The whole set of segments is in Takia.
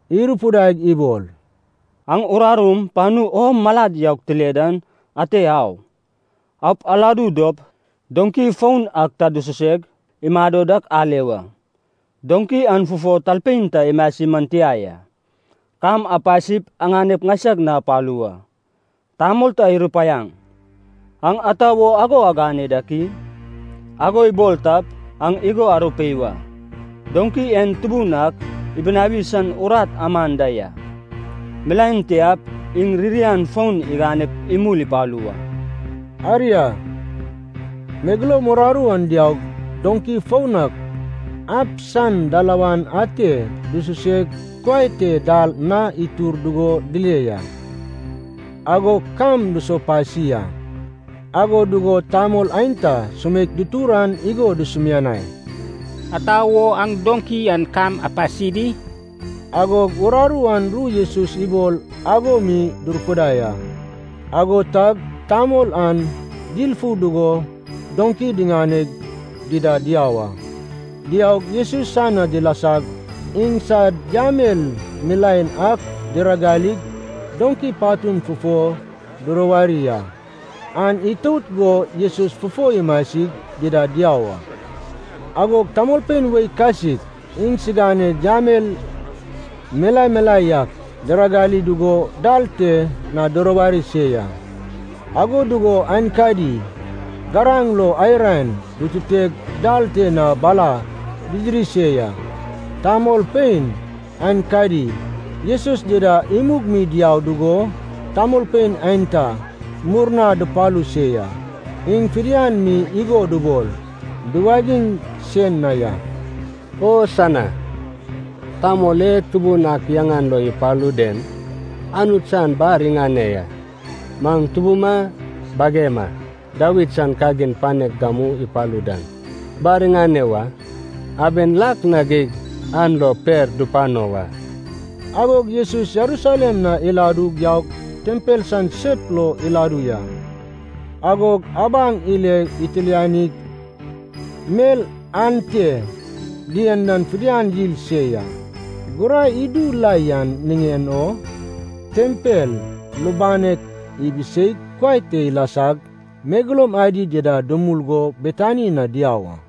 irupidaig ibol, “Aŋ urarum panu o malad yaug tile dan ate au. Aup aladu dop doŋki foun ak ta dususeg imado dak ale wa. Doŋki an fufo talpein ta imasi man tia ya. Kam apasip aŋanep ŋaisag na apalu wa. Tamol ta irupaiaŋ, ‘Aŋ ata wo ago agane dak i?’ ago ibol tap, aŋ igo arupei wa, ‘Doŋki en Tubun ak ibunawi san urat aman da ya. Milaen tiap iŋ ririan fon iganep imul ipalu wa.’” Aria, megeloum uraru an diaug, doŋki foun ak ab san dalawan ate dususeg kuai te dal na itur dugo dile ya. Agog kam dusopasi a. Ago dugo tamol aenta sumeik dutur an igo dusumianai, “Ata wo aŋ doŋki an kam apasi di?” Agog uraru an ru Jesus ibol ago mi durupidai a. Ago tag tamol an dilfu dugo doŋki diŋaneg dida diau a. Diaug, Jesus san na dilasag, iŋsad yamel milaen ak diragalig, doŋki patun fufo duruwari a. An itout go Jesus fufo imasig dida diau a. Agog tamolpein wei kasik iŋsiganed yamel milae milae yak diragali dugo dal te na duruwari se ya. Ago dugo aenkadi garaŋ lo ai raen dututeg dal te na bala didiri se ya. Tamolpein aenkadi, Jesus dida imug mi diau dugo, tamolpein aenta murna dupalu se ya, iŋ fidian mi igo dubol duwagiŋ se na ya, “Hosana! Tamol e Tubun ak yaŋan lo ipalu den, Anut san bar iŋane ya! Maŋ tubuma bagema Dawid san kagin panek gamu ipalu dan, bar iŋane wa! Aben lak na geig an lo per dupano wa!” Agog Jesus Jerusalem na iladug yaug, tempel san sep lo iladu ya. Agog abaŋ ile itilanig mel ante dien dan fidian yil se ya. Gurai idu la yan niŋen o tempel lubanek ibiseig kuai te ilasag megeloum adi dida dumul go Betani na diau a.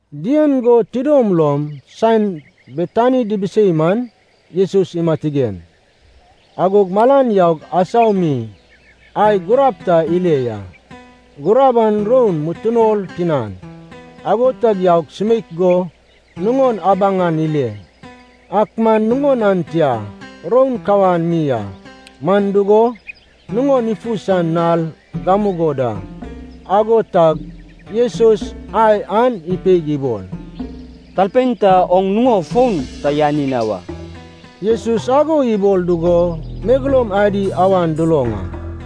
Dien go tidom lom saen Betani dibisei man, Jesus imatigen. Agog malan yaug, asau mi ai gurab ta ile ya. Gurab an roun mutunol tinan. Ago tag yaug sumeik go nuŋon abaŋ an ile, ak man nuŋon an tia, roun kawan mi a. Man dugo, nuŋon ifu san nal gamugo da. Ago tag Jesus ai an ipeig ibol, “Talpein ta oŋ nuŋo fon ta yani na wa.” Jesus ago ibol dugo megeloum adi awan duloŋ a.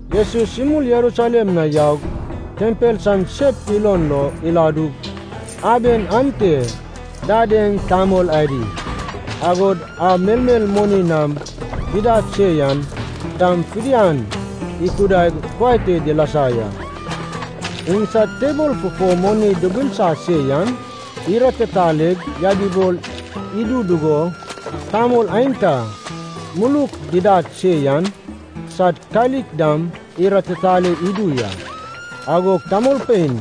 Jesus imul Jerusalem na yaug, tempel san sep ilon lo iladug, aben ante dadeŋ tamol adi, agod a melmel moni nam didad se yan dam fidian ikudaig kuai te dilasa ya. Iŋsad tebol fufo moni dubulsa se yan, iratitalaig yabibol idu dugo, tamol aenta muluk didad se yan sad kalik dam iratitale idu ya. Agog tamolpein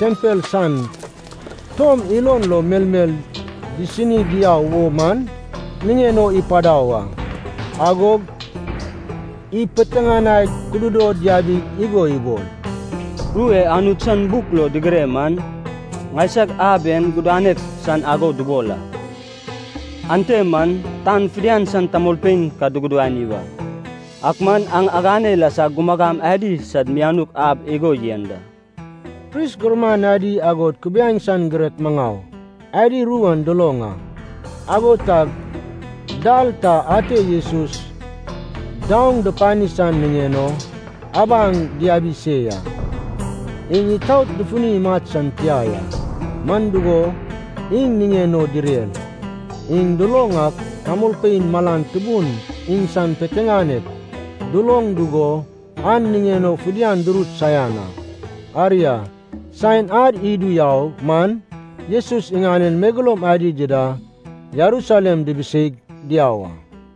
tempel san tom ilon lo melmel disini diau wo man niŋen o ipadau a. Agog ipiteŋanaig kududod yabig igo ibol, “Ru e Anut san buk lo digire man, ‘Ŋaisag ab en gudanek san ago dubol a, ante man tan fidian san tamolpein ka dugudani wa.’ Ak man aŋ agane ilasag ‘gumagam adi sad mianuk ab’ igo yen da.” Pris gurman adi agod kubiaeŋ san girek maŋau adi ru an duloŋ a. Ago tag dal ta ate Jesus daoŋ dupani san niŋen o abaŋ diabi se ya. Iŋ itaot dufuni imat san tia ya, man dugo, iŋ niŋen o direr. Iŋ duloŋ ak tamolpein malan tubun iŋsan piteŋanek duloŋ dugo an niŋen o fidian durut saian a. Aria, saen ad idu yau man Jesus iŋanen megeloum adi dida Jerusalem dibiseig diau a.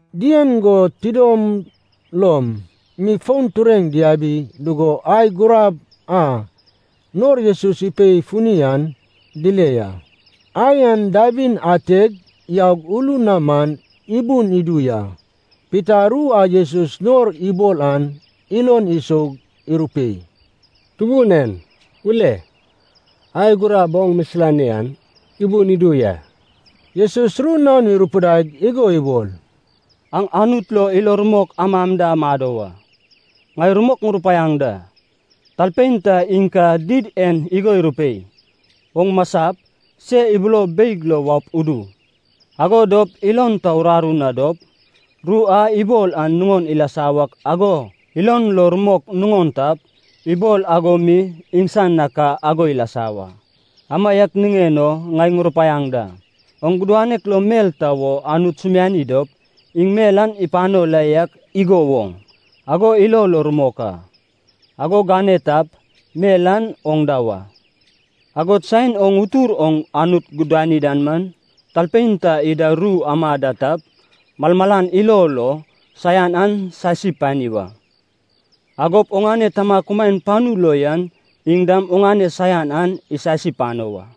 Dien go tidom lom mi fon tureŋ diabi dugo ai gurab a nor Jesus ipei funi an dile ya. Ai an dabin ateg yaug ulun na man ibun idu ya. Pita ru a Jesus nor ibol an ilon isoug irupei, “Tubun en, ule. Ai gurab oŋ misilani an ibun idu ya!” Jesus ru naon irupidaig igo ibol, “Aŋ Anut lo ilo rumok amam da amado wa. Ŋai rumok ŋurupaiaŋ da, talpein ta iŋ ka did en igo irupei, ‘Oŋ masap, se ibulo beig lo waup udu.’ Ago dop ilon ta uraru na dop, ru a ibol an nuŋon ilasa wak ago ilon lo rumok nuŋon tap, ibol ago mi iŋsan na ka ago ilasa wa. Amaiak niŋen o ŋai ŋurupaiaŋ da, oŋ gudanek lo mel ta wo Anut sumiani dop, iŋ mel an ipano la yak igo woŋ ago ilo lo rumok a. Ago gane tap, mel an oŋ da wa. Agod saen oŋ utur oŋ Anut gudani dan man, talpein ta ida ru ama da tap, malmalan ilo lo saian an sasi pani wa. Agop oŋane Tama kumaen panu lo yan iŋ dam oŋane saian an isasi pano wa.”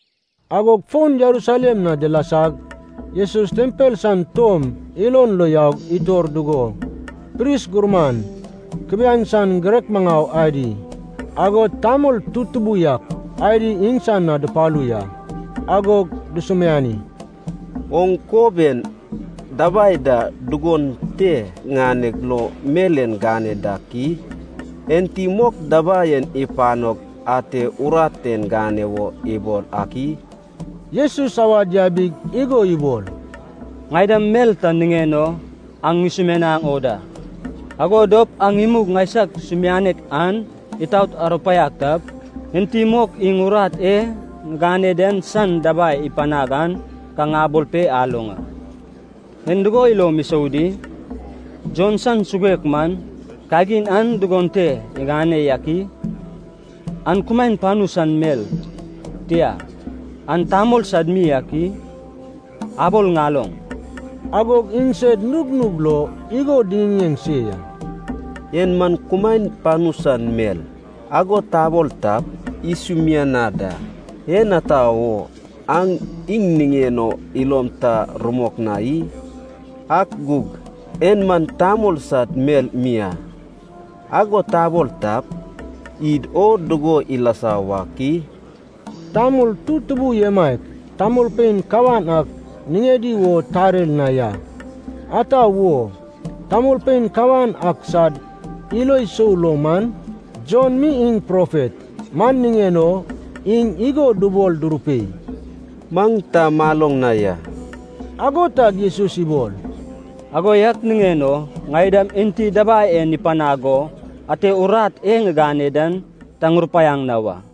Agog fon Jerusalem na dilasag, Jesus tempel san tom ilon lo yaug itor dugo, pris gurman, kubiaeŋ san girek maŋau adi, agod tamol tutubu yak adi iŋsan na dupalu ya. Agog dusumiani, “Oŋ kob en dabai da dugon te ŋaneg lo mel en gane dak i? Enti mok dabai en ipanog ate urat en gane wo ibol ak i?” Jesus awad yabig igo ibol, “Ŋai dam mel ta niŋen o aŋ ŋusumianaŋ o da. Ago dop aŋ imug ŋaisag sumianek an itaot arupaiag tap, enti mok iŋ urat e ŋigane den san dabai ipanag an ka ŋabol pe aloŋ a. En dugo ilom isou di? Jon san suguek man, kagin an dugon te iŋane yak i? An kumaen panu san mel, tia, an tamol sad mi ak i? Abol ŋaloŋ!” Agog iŋsed nugnug lo igo diŋiŋeŋ se ya. “En man kumaen panu san mel, ago tabol tap, iŋ igo ibol isumianad a, ‘En ata wo aŋ iŋ niŋen o ilom ta rumok na i?’ Ak gug ‘En man tamol sad mel mi a,’ ago tabol tap, id o dugo ilasa wak i?” (Tamol tutubu emaiak tamolpein kawan ak niŋedi wo tarer na ya, ata wo, tamolpein kawan ak sad ilo sou lo man, Jon mi iŋ profet.) Man niŋen o iŋ igo dubol durupei, “Maŋ ta maloŋ na ya.” Ago tag Jesus ibol, “Ago yak niŋen o ŋai dam enti dabai en ipanag go ate urat e ŋigane den ta ŋurupaiaŋ na wa.”